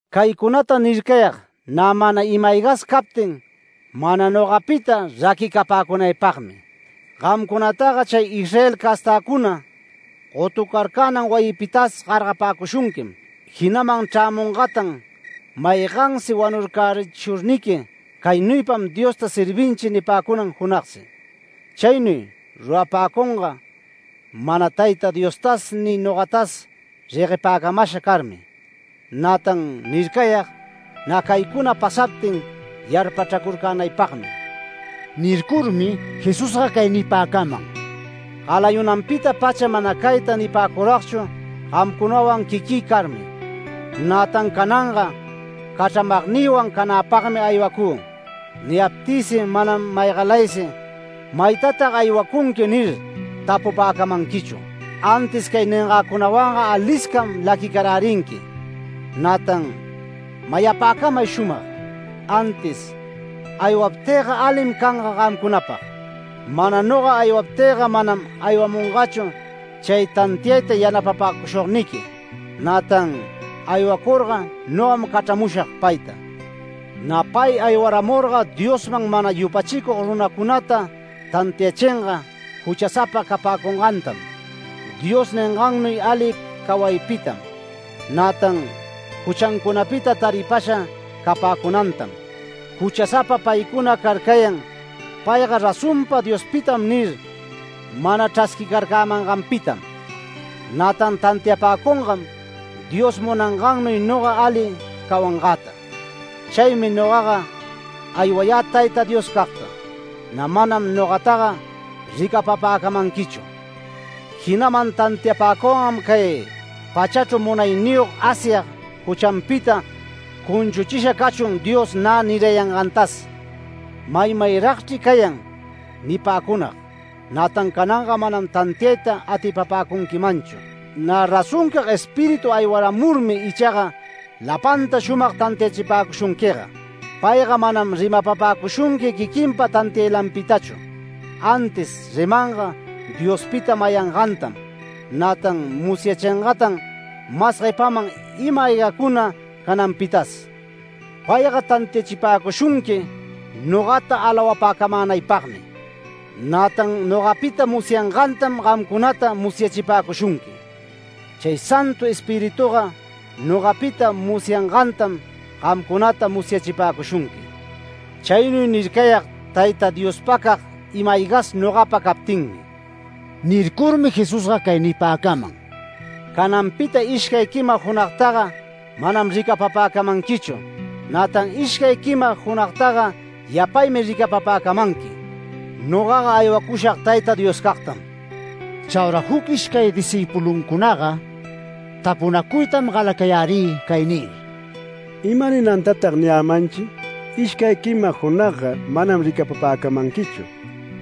“Caycunata nircayag, nä ima-aygas captin mana nogapita raquicapäcunaypagmi. Gamcunataga chay Israel castäcuna gotucarcänan wayipitas gargaripäcushunquim, jinaman chrämungatan maygansi wanurcärichishurniqui ‘Caynuypam Diosta servinchi’ nipäcunan junagsi. Chaynuy rurapäcunga mana Tayta Diostas ni nogatas reguepäcamasha carmi. Nätan nircayag, nä caycuna pasaptin yarpachracurcänaypagmi”. Nircurmi Jesusga cay nipäcaman: “Galayunanpita-pacha mana cayta nipäcuragchu, gamcunawan quiquï carmi. Nätan cananga cachramagnïwan canäpagmi aywacü. Niyaptïsi manam maygalaysi: ‘¿Maytatag aywacunqui?’ nir, tapupäcamanquichu. Antis cay ningäcunawanga aliscam laquicarärinqui. Nätan mayapäcamay shumag: Antis aywaptïga alim canga gamcunapag. Mana noga aywaptïga manam aywamungachu chay tantiayta yanapapäcushugniqui. Nätan aywacurga nogam cachramushag payta. Nä pay aywaramurga Diosman mana yupachicug runacunata tantiachinga juchasapa capäcungantam, Dios ningannuy ali cawaypitam, nätan juchancunapita taripasha capäcunantam. Juchasapa paycuna carcayan ‘Payga razonpa Diospitam’ nir, mana chrasquicarcämanganpitam. Nätan tantiapäcungam Dios munangannuy noga ali cawangäta. Chaymi nogaga aywayä Tayta Dioscagta. Nä manam nogataga ricapapäcamanquichu. Jinaman tantiapäcungam cay pachachru munayniyog Asyag juchanpita ‘Cunchuchisha cachun’ Dios nä nirayangantas. Maymayragchri cayan nipäcunag, nätan cananga manam tantiayta atipapäcunquimanchu. Nä razoncag Espíritu aywaramurmi ichaga lapanta shumag tantiachipäcushunquiga. Payga manam rimapapäcushunqui quiquinpa tantiaylanpitachu, antis rimanga Diospita mayangantam, nätan musyachingatan mas guepaman ima-aygacuna cananpitas. Payga tantiachipäcushunqui nogata alawapäcamänaypagmi. Nätan nogapita musyangantam gamcunata musyachipäcushunqui. Chay Santu Espirituga nogapita musyangantam gamcunata musyachipäcushunqui. Chaynuy nircayag Tayta Diospacag ima-aygas nogapa captinmi”. Nircurmi Jesusga cay nipäcaman: “Cananpita ishcay quima junagtaga manam ricapapäcamanquichu, nätan ishcay quima junagtaga yapaymi ricapapäcamanqui. Nogaga aywacushag Tayta Dioscagtam”. Chaura juc ishcay discïpuluncunaga tapunacuytam galacayärï cay nir: “¿Ima ninantatag niyämanchi: ‘Ishcay quima junagga manam ricapapäcamanquichu,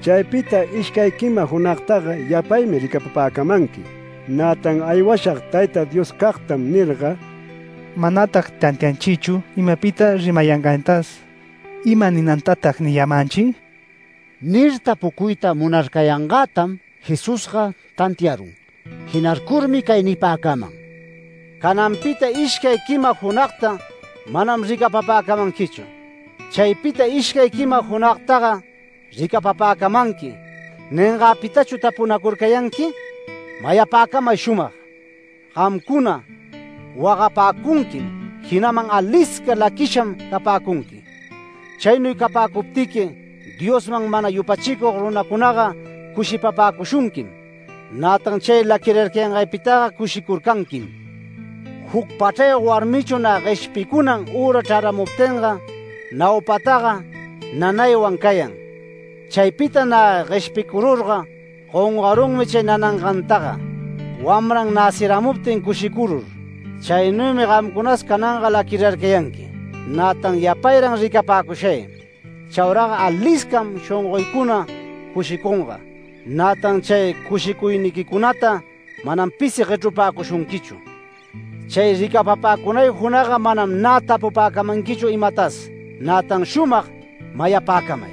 chaypita ishcay quima junagtaga yapaymi ricapapäcamanqui, nätan aywashag Tayta Dioscagtam’ nirga? Manatag tantianchichu imapita rimayangantas. ¿Ima ninantatag niyämanchi?” Nir tapucuyta munarcayangätam Jesusga tantiarun. Jinarcurmi cay nipäcaman: “ ‘Cananpita ishcay quima junagta manam ricapapäcamanquichu, chaypita ishcay quima junagtaga ricapapäcamanqui’ ¿ningäpitachu tapunacurcayanqui? Mayapäcamay shumag: Gamcuna wagapäcunquim, jinaman alisca laquisham capäcunqui. Chaynuy capäcuptiqui Diosman mana yupachicug runacunaga cushipapäcushunquim. Nätan chay laquirarcayangaypitaga cushicurcanquim. Juc pachrayog warmichu nä gueshpicunan üra chraramuptinga, naupataga nanaywan cayan. Chaypita nä gueshpicururga gongarunmi chay nanangantaga, wamran näciramuptin cushicurur. Chaynuymi gamcunas cananga laquirarcayanqui. Nätan yapayran ricapäcushay. Chauraga aliscam shongoycuna cushicunga, nätan chay cushicuyniquicunata manam pisi guechrupäcushunquichu. Chay ricapapacunay junagga manam nä tapupäcamanquichu imatas. Nätan shumag mayapäcamay: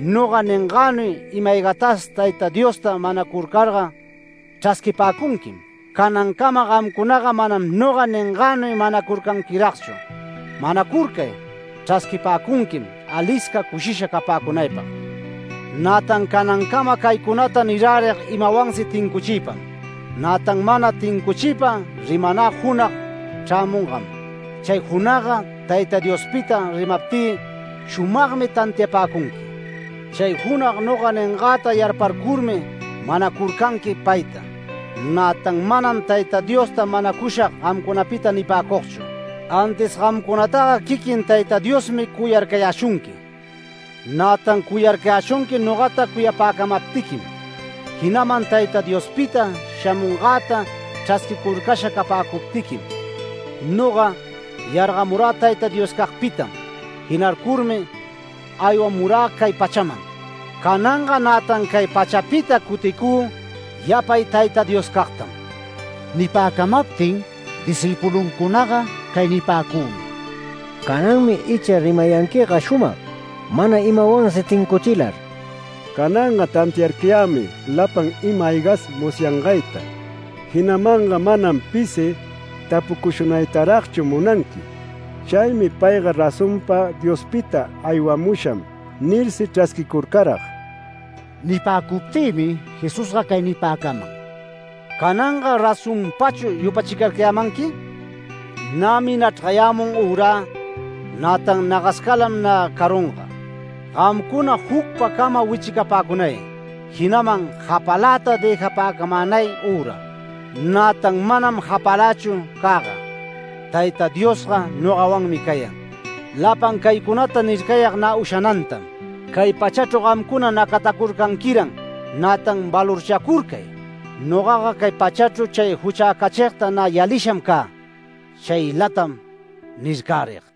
Noga ningänuy ima-aygatas Tayta Diosta manacurcarga chrasquipäcunquim. Canancama gamcunaga manam noga ningänuy manacurcanquiragchu. Manacurcay, chrasquipäcunquim alisca cushisha capäcunaypag. Nätan canancama caycunata nirärig imawansi tincuchiypam. Nätan mana tincuchiypa rimanä junag chrämungam. Chay junagga Tayta Diospita rimaptï shumagmi tantiapäcunqui. Chay junag noga ningäta yarparcurmi manacurcanqui payta. Nätan manam Tayta Diosta manacushag gamcunapita nipäcugchu. Antis gamcunataga quiquin Tayta Diosmi cuyarcayäshunqui. Nätan cuyarcayäshunqui nogata cuyapäcamaptiquim, jinaman Tayta Diospita shamungäta chrasquicurcasha capäcuptiquim. Noga yargamurä Tayta Dioscagpitam. Jinarcurmi aywamurä cay pachaman. Cananga nätan cay pachapita cuticü yapay Tayta Dioscagtam”. Nipäcamaptin discïpuluncunaga cay nipäcümi: “Cananmi icha rimayanquiga shumag, mana imawansi tincuchilar. Cananga tantiarcayämi lapan ima-aygas musyangayta, jinamanga manam pisi tapucushunaytaragchu munanqui. Chaymi ‘Payga razonpa Diospita aywamusham’ nirsi chrasquicurcarag”. Nipäcuptïmi Jesusga cay nipäcaman: “Cananga ¿razonpachu yupachicarcayämanqui? Nämi nachrgayämun ürä, nätan nagascalam nä carunga. Gamcuna jucpacama wichicapäcunay, jinaman japaläta dëjapäcamänay üra. Nätan manam japalächu cäga. Tayta Diosga nogawanmi cayan. Lapan caycunata nircayag nä ushanantam, cay pachachru gamcuna nacatacurcanquiran, nätan valorchacurcay. Nogaga cay pachachru chay juchäcachigta nä yalisham cä. Chaylatam nircärig”.